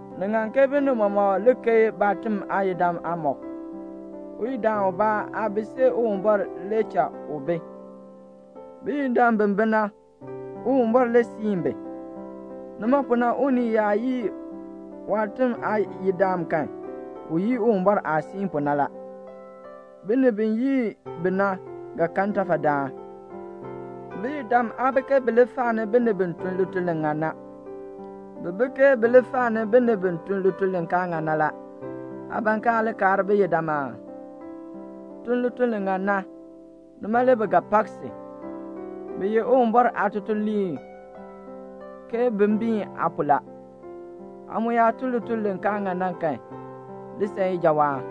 Ni ŋan ke binib mɔmɔk keei baatiŋ aayidam aamɔb. Uyidaan ubaa aa bi see Uwumbɔr li cha u bi. Biyidam bi bi na, Uwumbɔr le siin bi. Nima pu na unii yaa yii waatiŋ aayidam kan, u yii Uwumbɔr aah siin pu na la. Binib bi yii bi na ga kan ntafadaan. Biyidam aa bi ke bi faani binib bi tun lituln li ŋan na. Bi bi ke bi faani binib bi tun lituln li kaa ŋan na la. Aa ban ke aa li kaar biyidam aa? Tun lituln li ŋan na, nima le bi ga pak si. Bi ye Uwumbɔr aatutuliib ke bin biin aa pu la. Aa mu yaa tun lituln li kaa ŋan na kan, li san ijawaan.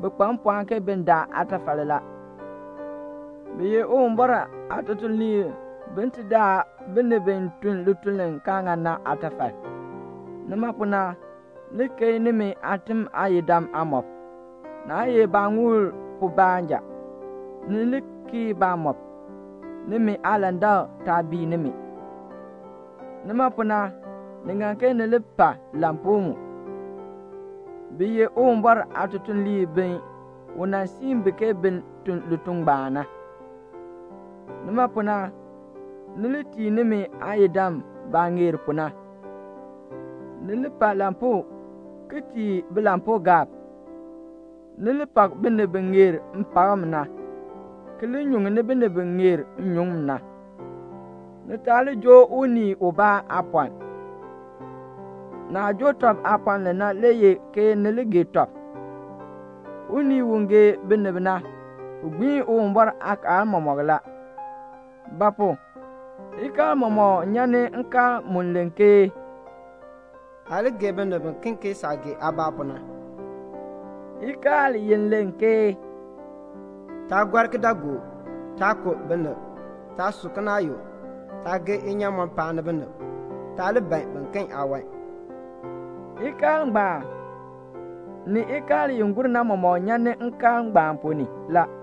Bi kpa mpɔɔn ke bin daa aatafal la. Bi ye Uwumbɔr aatutuliib bin ti daa binib bi tun lituln li kaa ŋan na aatafal. Nima pu na ni li keei nimi aatiŋ aayidam aamɔb. Naa ye baaŋuul pu baanja. Ni li kii baamɔb, nimi aalandak taa bii nimi. Nima pu na ni ŋan ke ni li pa lampuu mu. Bi ye Uwumbɔr aatutuliib bi u nan siin bi ke bin tun lituln ngbaan na. Nima pu na, ni li tii nimi aayidam baah ŋeer pu na. Ni li pa lampuu ki tii bilampuugaab. Ni li pak binib bi ŋeer mpakm na, ki li nyuŋni binib bi ŋeer nnyuŋ na. Ni taa li joo unii ubaa aapɔln. Naah joo tɔb aapɔln li na le ye ke ni li gee tɔb. Unii u gee binib na, u gbiin Uwumbɔr aakaal mɔmɔk la. Ba pu? ikaal mɔmɔk nyan ni nkaal mu len ke "Aa li gee binib biken ke saah gee aabaa pu na." Ikaal i len ke "Taa gɔr kidaagook, taa ku binib, taa su kinaayuk, taa gee nnyaamɔn paani binib, taa li ban biken aawan," ikaal ngbaan, ni ikaal i gur na mɔmɔk nyan ni nkaal ngbaan ponn ni la.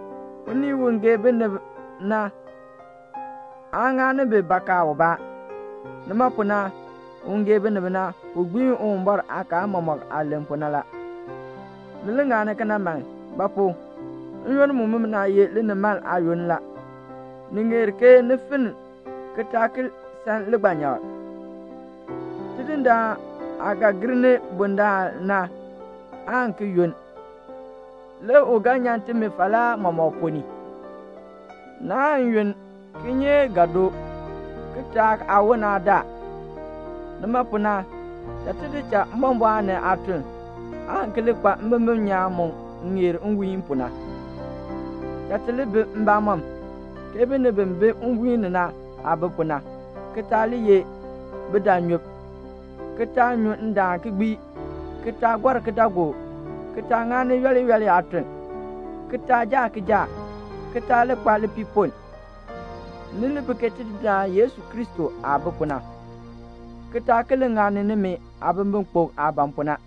Unii u gee binib na aan ŋani bi bakaa ubaa. Nima pu na, un gee binib na, u gbiin Uwumbɔr aakaal mɔmɔk aah len pu na la. Ni li ŋani kena man. Ba pu? n-yoonn mumina ye linimaln aayoonn la. Ni ŋeer ke ni finn ki taa ki san ligbanyakl. Tidindaan aah ga gir ni bundaln na aan ki yunn. Le u ga nyan timi falaa mɔmɔk ponn ni. Naan yunn, kinyeek ga doo. Kitaak aawoln aa daa. Nima pu na, cha ti di cha mbɔmbɔɔn ni aatuln, aan ki li kpa mbimbin nyaan mu ŋeer nwiihn pu na. Cha ti li bi mbamɔm, ke binib bi bi nwiihn ni na aah bi pu na, ki taa li ye bidaanyub, ki taa nyu ndaan ki gbii, ki taa gɔr kidaagook, ki taa ŋani yooli yooli aatuln, ki taa jaa kijaak, ki taa li kpa lipiipoln. Ni li bi ke Tidindaan Yesu Kristo aah bi pu na, ki taa ki li ŋani nimi aabimbikpok aah ban pu na.